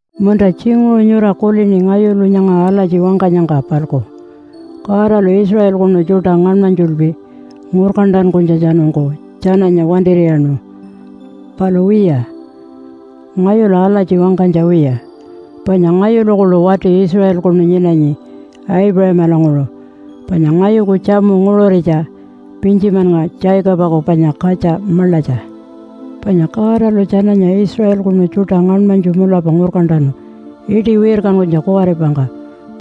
Munta tjinguṟu nyura kulini ngayulu nyanga alatji wangkanyangka-palku Godalu Israelkunu tjuṯa ngaṉmanytjulpi ngurkantankunytjatjanungku tjananya wantir'iyaṉu. Palu wiya, ngayulu alatji wangkanytja wiya! Panya ngayulu kuḻu wati Israelkunu nyinanyi, Aipuṟamalanguṟu. Panya ngayuku tjamu nguṟuritja Pintjimannga Jacobaku panya katja maḻatja. Panya Godalu tjananya Israelkunu tjuṯa ngaṉmanytju mulapa ngurkantanu iṯi wirkankunytja kuwaripangka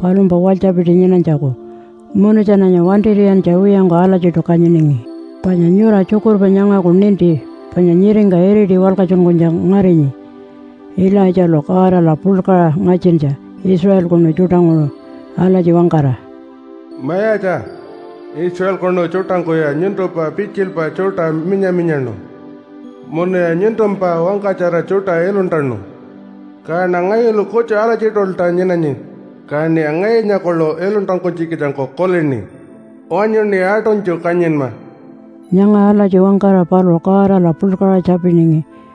palumpa walytjapiti nyinanytjaku munu tjananya wantir'iyantja wiyangku alatjiṯu kanyiningi. Panya nyura tjukurpa nyangaku ninti panya nyiringka iriti walkatjunkunytja ngarinyi Ilaitjalu Godala puḻkaṟa ngatjintja Israelkunu tjuṯanguṟu alatji wangkara, “Mayatja, Israelkunu tjuṯangkuya nyuntumpa pitjilpa tjuṯa minya-minyaṉu, munuya nyuntumpa wangkatjara tjuṯa iluntanu. Kaṉa ngayulu kutju alatjiṯulta nyinanyi, kaṉiya ngayunya kuḻu iluntankunytjikitjangku kulini. Wanyuṉi aṯunytju kanyinma.” Nyanga alatji wangkara paluṟu Godala puḻkaṟa tjapiningi.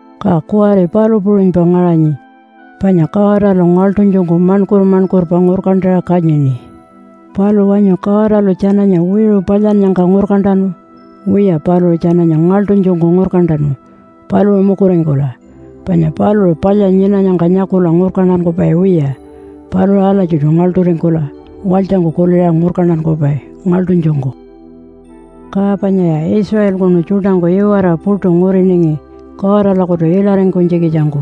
Ka kuwari palu puṟunypa ngaṟanyi, panya Godalu ngaḻṯunytjungku maṉkur-maṉkurpa ngurkantaṟa kanyini. Palu wanyu Godalu tjananya wiṟu palyannyangka ngurkantanu? Wiya paluṟu tjananya ngaḻṯunytjungku ngurkantanu, paluṟu mukuringkula. Panya paluṟu palya nyinanyangka nyakula ngurkantankupai wiya. Paluṟu alatjiṯu ngaḻṯuringkula walytjangku kuliṟa ngurkantankupai ngaḻṯunytjungku. Ka panyaya Israelkunu tjuṯangku iwara puṯu nguriningi Godalakutu ilaringkunytjikitjangku.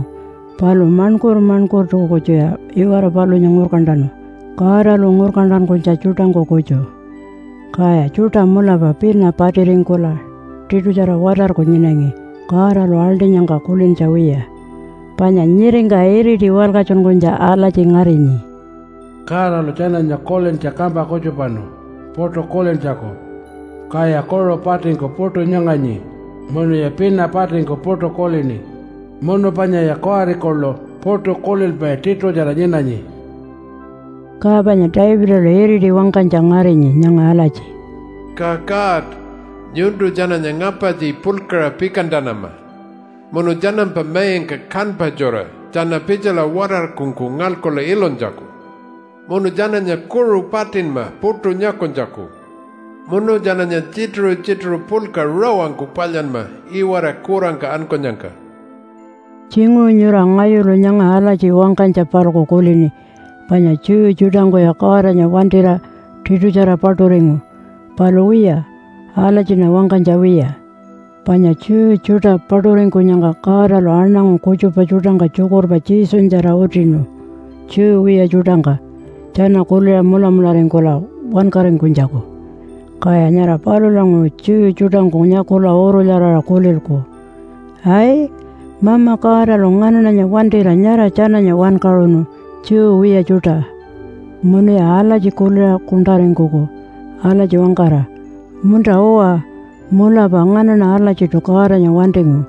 Palu maṉkur-maṉkurtu kutjuya iwara palunya ngurkantanu Godalu ngurkantankunytja tjuṯangku kutju. Kaya tjuṯa mulapa pina patiringkula tiṯutjara watarku nyinangi Godalu aḻṯinyangka kulintja wiya. Panya nyiringka iriti walkatjunkunytja alatji ngarinyi, “Godalu tjananya kulintja kampa kutjupanu puṯu kulintjaku, kaya kuṟu patingku puṯu nyanganyi munuya pina patingku puṯu kulini munu panyaya kuwari kuḻu puṯu kulilpai tiṯutjara nyinanyi.” Ka panya Davidalu iriti wangkanytja ngarinyi nyanga alatji, “Ka God, nyuntu tjananya ngapartji puḻkaṟa pikantanama, munu tjanampa maingka kanpa tjura tjana pitjala watarkungku ngalkula ilunytjaku. Munu tjananya kuṟu patinma puṯu nyakunytjaku. Munu tjananya tjituṟu-tjituṟu puḻka rawangku palyanma iwara kurangka ankunyangka.” Tjinguṟu nyura ngayulu nyanga alatji wangkanytja-palku kulini panya Jew tjuṯangkuya Godanya wantira tiṯutjara paṯuringu. Palu wiya, alatjiṉa wangkanytja wiya! Panya Jew tjuṯa paṯuringkunyangka Godalu aṉangu kutjupa tjuṯangka tjukurpa Jesunyatjara utinu Jew wiya tjuṯangka tjana kuliṟa mulamularingkula wankaringkunytjaku, kaya nyara palulanguṟu Jew tjuṯangku nyakula urulyaraṟa kulilku, “Ai, Mama Godalu nganaṉanya wantira nyara tjananya wankaṟunu Jew wiya tjuṯa.” Munuya alatji kuliṟa kuṉṯaringkuku alatji wangkara, “Munta-uwa mulapa nganaṉa alatjiṯu Godanya wantingu.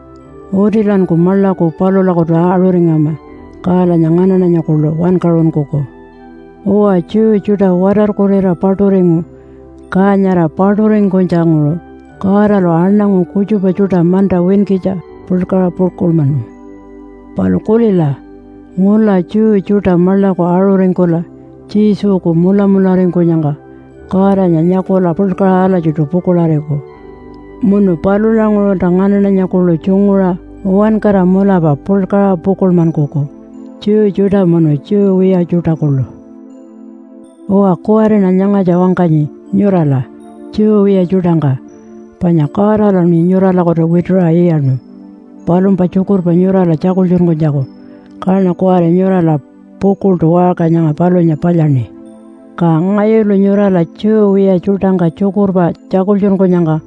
Utilanku maḻaku palulakutu aṟuringama, kalanya nganaṉanya kuḻu wankaṟunkuku.” Uwa, Jew tjuṯa watarkurira paṯuringu, ka nyara paṯuringkunytjanguṟu Godalu aṉangu kutjupa tjuṯa manta winkitja puḻkaṟa pukuḻmanu. Palu kulila, ngula Jew tjuṯa maḻaku aṟuringkula Jesuku mulamularingkunyangka Godanya nyakula puḻkaṟa alatjiṯu pukuḻariku. Munu palulanguṟulta nganaṉanya kuḻu tjunguṟa uwankara mulapa puḻkaṟa pukuḻmankuku, Jew tjuṯa munu Jew wiya tjuṯa kuḻu. Uwa, kuwariṉa nyangatja wangkanyi nyurala Jew wiya tjuṯangka. Panya Godaluṉi nyuralakutu wituṟa iyaṉu palumpa tjukurpa nyurala tjakultjunkunytjaku, kaṉa kuwari nyurala pukuḻṯu waṟka nyanga palunya palyaṉi. Ka ngayulu nyurala Jew wiya tjuṯangka tjukurpa tjakultjunkunyangka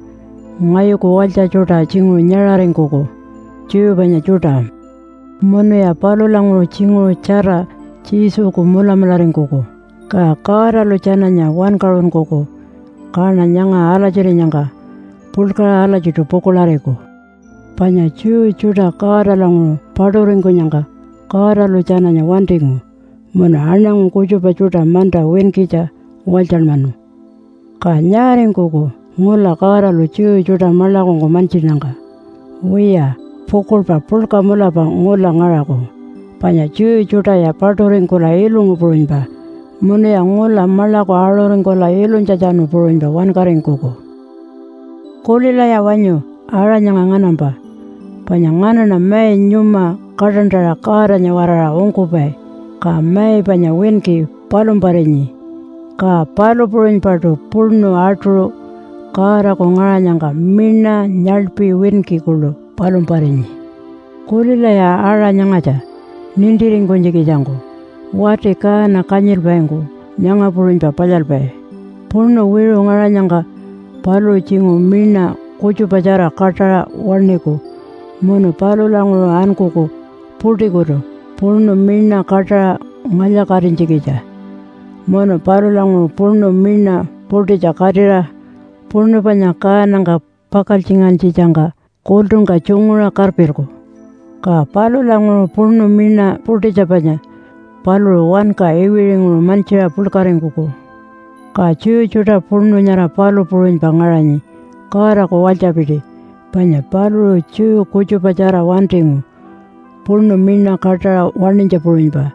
ngayuku walytja tjuṯa tjinguṟu nyaṟaringkuku, Jew panya tjuṯa, munuya palulanguṟu tjinguṟu tjara Jesuku mulamularingkuku, ka Godalu tjananya wankaṟunkuku. Kaṉa nyanga alatjirinyangka puḻkaṟa alatjiṯu pukuḻariku. Panya Jew tjuṯa Godalanguṟu paṯuringkunyangka Godalu tjananya wantingu munu aṉangu kutjupa tjuṯa manta winkitja walytjanmanu. Ka nyaaringkuku ngula Godalu Jew tjuṯa maḻakungku mantjinnyangka? Wiya, pukuḻpa puḻka mulapa ngula ngaṟaku panya Jew tjuṯaya paṯuringkula ilungu puṟunypa munuya ngula maḻaku aṟuringkula ilunytjatjanu puṟunypa wankaringkuku. Kulilaya wanyu aṟa nyanga nganampa. Panya nganaṉa mai nyuma kaṯantaṟa Godanya-waraṟa ungkupai, ka mai panya winki palumparinyi. Ka palu puṟunypaṯu puṉu atuṟu Godaku ngaṟanyangka miṉa nyaḻpi winki kuḻu palumparinyi. Kulilaya aṟa nyangatja, nintiringkunytjikitjangku. Wati kaana kanyilpaingku nyanga puṟunypa palyalpai. Puṉu wiṟu ngaṟanyangka paluṟu tjinguṟu miṉa kutjupatjara kaṯaṟa waṉiku munu palulanguṟu ankuku puṯikutu puṉu miṉa kaṯaṟa ngalya-katinytjikitja. Munu palulanguṟu puṉu miṉa puṯitja katira puṉu panya kaanangka pakaltjingantjitjangka kultungka tjunguṟa karpilku. Ka palulanguṟu puṉu miṉa puṯitja panya paluṟu wanka iwiṟinguṟu mantjiṟa puḻkaringkuku. Ka Jew tjuṯa puṉu nyara palu puṟunypa ngaṟanyi Godaku walytjapiti, panya paluṟu Jew kutjupatjara wantingu puṉu miṉa kaṯaṟa waṉinytja puṟunypa,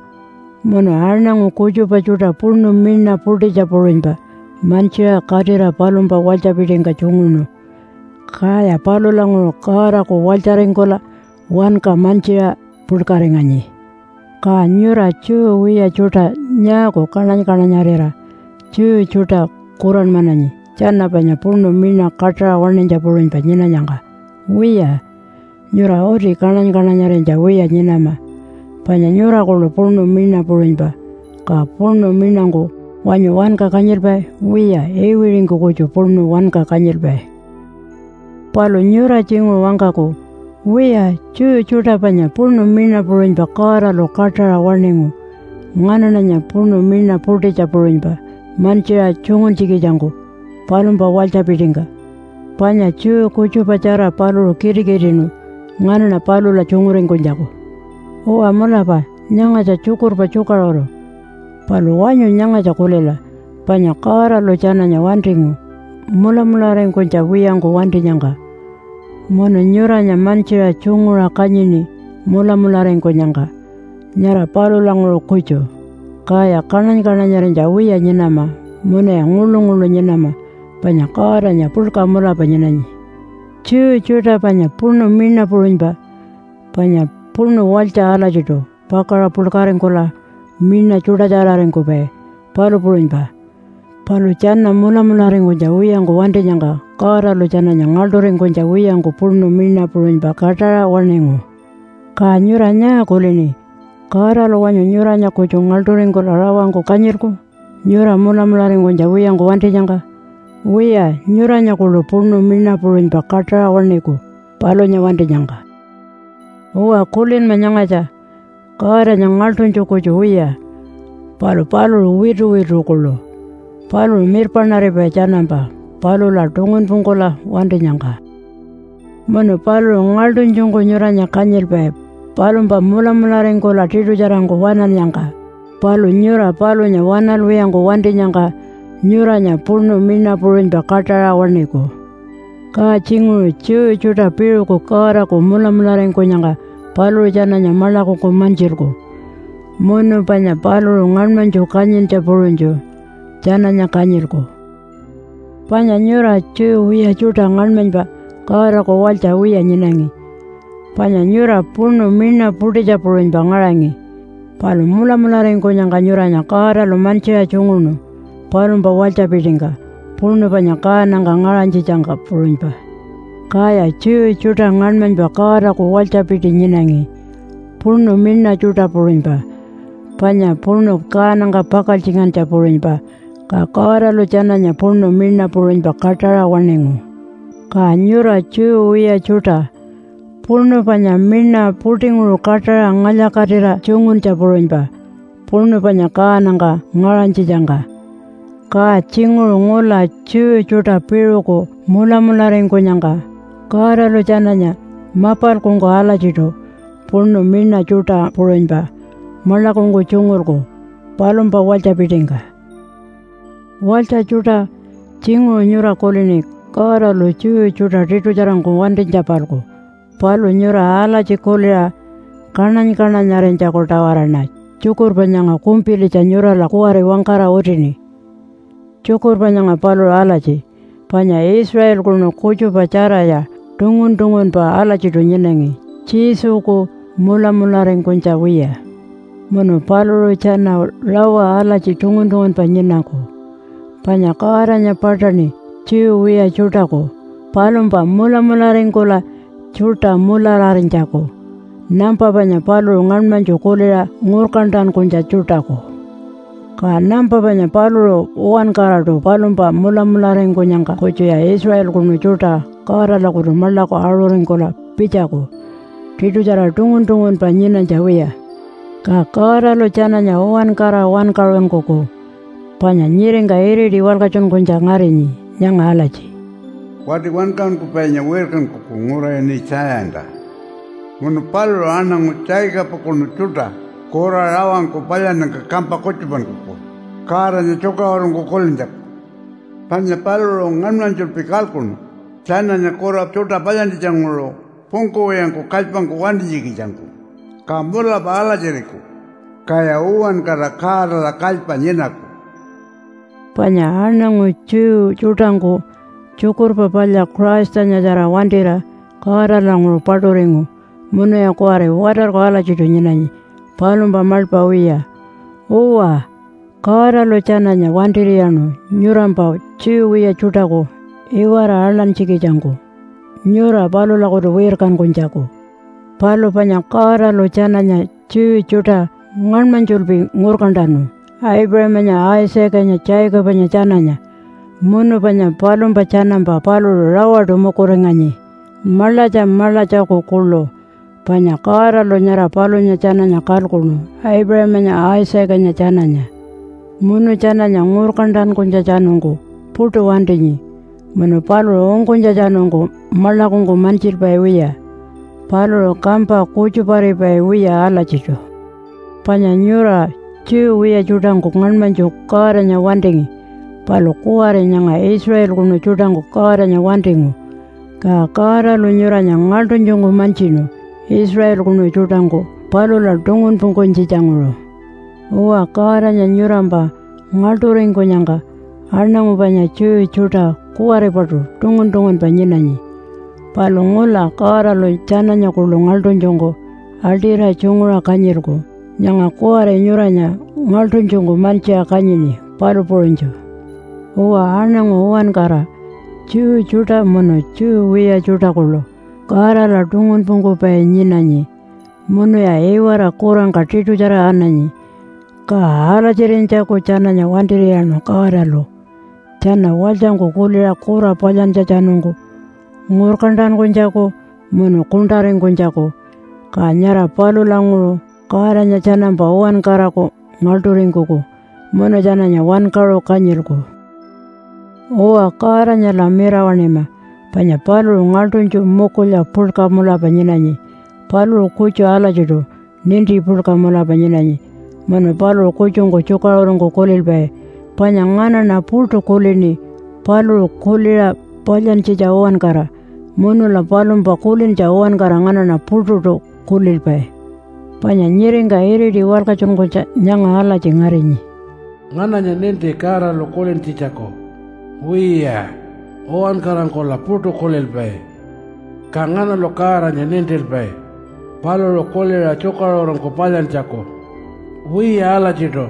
munu aṉangu kutjupa tjuṯa puṉu miṉa puṯitja puṟunypa mantjiṟa katira palumpa walytjapitingka tjunguṉu. Kaya palulanguṟu Godaku walytjaringkula wanka mantjiṟa puḻkaringanyi. Ka nyura Jew wiya tjuṯa nyaaku kaṉany-kaṉanyarira Jew tjuṯa kuranmananyi tjana panya puṉu miṉa kaṯaṟa waṉinytja puṟunypa nyinanyangka? Wiya, nyura uti kaṉany-kaṉanyarinytja wiya nyinama, panya nyura kuḻu puṉu miṉa puṟunypa. Ka puṉu miṉangku wanyu wanka kanyilpai? Wiya, iwiṟingku kutju puṉu wanka kanyilpai. Palu nyura tjinguṟu wangkaku, “Wiya, Jew tjuṯa panya puṉu miṉa puṟunypa Godalu kaṯaṟa waṉingu nganaṉanya puṉu miṉa puṯitja puṟunypa mantjiṟa tjunguntjikitjangku palumpa walytjapitingka. Panya Jew kutjupatjara paluṟu kitikitiṉu nganaṉa palula tjunguringkunytjaku.” Uwa mulapa nyangatja tjukurpa tjukaṟuru. Palu wanyu nyangatja kulila, panya Godalu tjananya wantingu mulamularingkunytja wiyangku wantinyangka. Munu nyuranya mantjiṟa tjunguṟa kanyini mulamularingkunyangka, nyara palulanguṟu kutju. Kaya kaṉany-kaṉanyarinytja wiya nyinama, munuya nguḻu-nguḻu nyinama panya Godanya puḻka mulapa nyinanyi. Jew tjuṯa panya puṉu miṉa puṟunypa, panya puṉu walytja alatjiṯu pakaṟa puḻkaringkula miṉa tjuṯatjararingkupai, palu puṟunypa. Palu tjana mulamularingkunytja wiyangku wantinyangka Godalu tjananya ngaḻṯuringkunytja wiyangku puṉu miṉa puṟunypa kaṯaṟa waṉingu. Ka nyura nyaa kulini? Godalu wanyu nyuranya kutju ngaḻṯuringkula rawangku kanyilku nyura mulamularingkunytja wiyangku wantinyangka? Wiya, nyuranya kuḻu puṉu miṉa puṟunypa kaṯaṟa waṉiku palunya wantinyangka. Uwa kulinma nyangatja. Godanya ngaḻṯunytju kutju wiya palu paluṟu wituwitu kuḻu. Paluṟu mirpaṉaripai tjanampa palula tungunpungkula wantinyangka. Munu paluṟu ngaḻṯunytjungku nyuranya kanyilpai palumpa mulamularingkula tiṯutjarangku waṉannyangka. Palu nyura palunya waṉalwiyangku wantinyangka nyuranya puṉu miṉa puṟunypa kaṯaṟa waṉiku. Ka tjinguṟu Jew tjuṯa piṟuku Godaku mulamularingkunyangka paluṟu tjananya maḻakungku mantjilku, munu panya paluṟu ngaṉmanytju kanyintja puṟunytju tjananya kanyilku. Panya nyura Jew wiya tjuṯa ngaṉmanypa Godaku walytja wiya nyinangi. Panya nyura puṉu miṉa puṯitja puṟunypa ngaṟangi, palu mulamularingkunyangka nyuranya Godalu mantjiṟa tjunguṉu palumpa walytjapitingka puṉu panya kaanangka ngaṟanytjitjangka puṟunypa. Kaya Jew tjuṯa ngaṉmanypa Godaku walytjapiti nyinangi, puṉu miṉa tjuṯa puṟunypa panya puṉu kaanangka pakaltjingantja puṟunypa. Ka Godalu tjananya puṉu miṉa puṟunypa kaṯaṟa waṉingu. Ka nyura Jew wiya tjuṯa, puṉu panya miṉa puṯinguṟu kaṯaṟa ngalya-katira tjunguntja puṟunypa, puṉu panya kaanangka ngaṟanytjitjangka. Ka tjinguṟu ngula Jew tjuṯa piṟuku mulamularingkunyangka Godalu tjananya mapalkungku alatjiṯu puṉu miṉa tjuṯa puṟunypa maḻakungku tjungulku palumpa walytjapitingka. Walytja tjuṯa! Tjinguṟu nyura kulini Godalu Jew tjuṯa tiṯutjarangku wantinytja-palku. Palu nyura alatji kuliṟa kaṉany-kaṉanyarinytjaku-tawaraṉa tjukurpa nyanga kumpilitja nyurala kuwari wangkara utini. Tjukurpa nyanga paluṟu alatji, panya Israelkunu kutjupa tjaraya tungun-tungunpa alatjiṯu nyinanyi Jesuku mulamularingkunytja wiya. Munu paluṟu tjana rawa alatji tungun-tungunpa nyinaku, panya Godanya paṯaṉi Jew wiya tjuṯaku palumpa mulamularingkula tjuṯa mulararinytjaku, nampa panya paluṟu ngaṉmanytju kuliṟa ngurkantankunytja tjuṯaku. Ka nampa panya paluṟu uwankaraṯu palumpa mulamularingkunyangka kutjuya Israelkunu tjuṯa Godalakutu maḻaku aṟuringkula pitjaku tiṯutjara tungun-tungunpa nyinanytja wiya. Ka Godalu tjananya uwankara wankaṟunkuku. Panya nyiringka iriti walkatjunkunytja ngarinyi nyanga alatji, “Wati Wankaṟunkupainya wirkankuku ngura ini Tjayanta. Munu paluṟu aṉangu Jacobakunu tjuṯa kura rawangku palyannyangka kampa kutjupankuku Godanya tjukaṟurungku kulintjaku. Panya paluṟu ngaṉmanytjulpi kalkuṉu tjananya kura tjuṯa palyantjitjanguṟu pungkuwiyangku kalypangku wantinytjikitjangku. Ka mulapa alatjiriku. Kaya uwankara Godala kalypa nyinaku.” Panya aṉangu Jew tjuṯangku Tjukurpa Palya Christanyatjara wantira Godalanguṟu paṯuringu munuya kuwari watarku alatjiṯu nyinanyi palumpa maḻpa wiya. Uwa, Godalu tjananya wantir'iyaṉu nyurampa, Jew wiya tjuṯaku, iwara aḻantjikitjangku nyura palulakutu wirkankunytjaku. Palu panya Godalu tjananya Jew tjuṯa ngaṉmanytjulpi ngurkantanu Aipuṟamanya, Isaacanya, Jacobanya tjananya, munu panya palumpa tjanampa paluṟu rawaṯu mukuringanyi maḻatja maḻatjaku kuḻu. Panya Godalu nyara palunya tjananya kalkuṉu Aipuṟamanya, Isaacanya tjananya. Munu tjananya ngurkantankunytjatjanungku puṯu wantinyi munu paluṟu ungkunytjatjanungku maḻakungku mantjilpai wiya. Paluṟu kampa kutjuparipai wiya alatjiṯu. Panya nyura Jew wiya tjuṯangku ngaṉmanytju Godanya wantingi. Palu kuwari nyanga Israelkunu tjuṯangku Godanya wantingu, ka Godalu nyuranya ngaḻṯunytjungku mantjinu Israelkunu tjuṯangku palula tungunpungkunytjitjanguṟu. Uwa, Godanya nyurampa ngaḻṯuringkunyangka, aṉangu panya Jew tjuṯa kuwaripaṯu tungun-tungunpa nyinanyi. Palu ngula Godalu tjananya kuḻu ngaḻṯunytjungku aḻṯira tjunguṟa kanyilku, nyanga kuwari nyuranya ngaḻṯunytjungku mantjiṟa kanyini, palu puṟunytju. Uwa, aṉangu uwankara Jew tjuṯa munu Jew wiya tjuṯa kuḻu Godala tungunpungkupai nyinanyi munuya iwara kurangka tiṯutjara ananyi. Ka alatjirinytjaku tjananya wantir'iyaṉu Godalu tjana walytjangku kuliṟa kura palyantjatjanungku ngurkantankunytjaku munu kuṉṯaringkunytjaku. Ka nyara palulanguṟu Godanya tjanampa uwankaraku ngaḻṯuringkuku munu tjananya wankaṟu kanyilku. Uwa, Godanyala mirawaṉima panya paluṟu ngaḻṯunytju mukulya puḻka mulapa nyinanyi. Paluṟu kutju alatjiṯu ninti puḻka mulapa nyinanyi munu paluṟu kutjungku tjukaṟurungku kulilpai. Panya nganaṉa puṯu kulini paluṟu kuliṟa palyantjitja uwankara, munula palumpa kulintja uwankara nganaṉa puṯuṯu kulilpai. Panya nyiringka iriti walkatjunkunytja nyanga alatji ngarinyi, “Ngananya ninti Godalu kulintjitjaku? Wiya, uwankarangkula puṯu kulilpai. Ka nganalu Godanya nintilpai paluṟu kuliṟa tjukaṟurungku palyantjaku? Wiya alatjiṯu,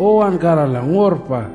uwankarala ngurpa.”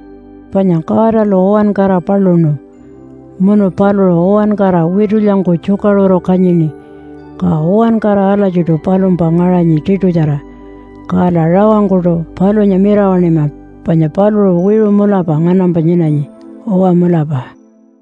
Panya Godalu uwankara paluṉu. Munu paluṟu uwankara witulyangku tjukaṟuru kanyini. Ka uwankara alatjiṯu palumpa ngaṟanyi tiṯutjara. Kala rawangkuṯu palunya mirawaṉima panya paluṟu wiṟu mulapa nganampa nyinanyi. Uwa mulapa.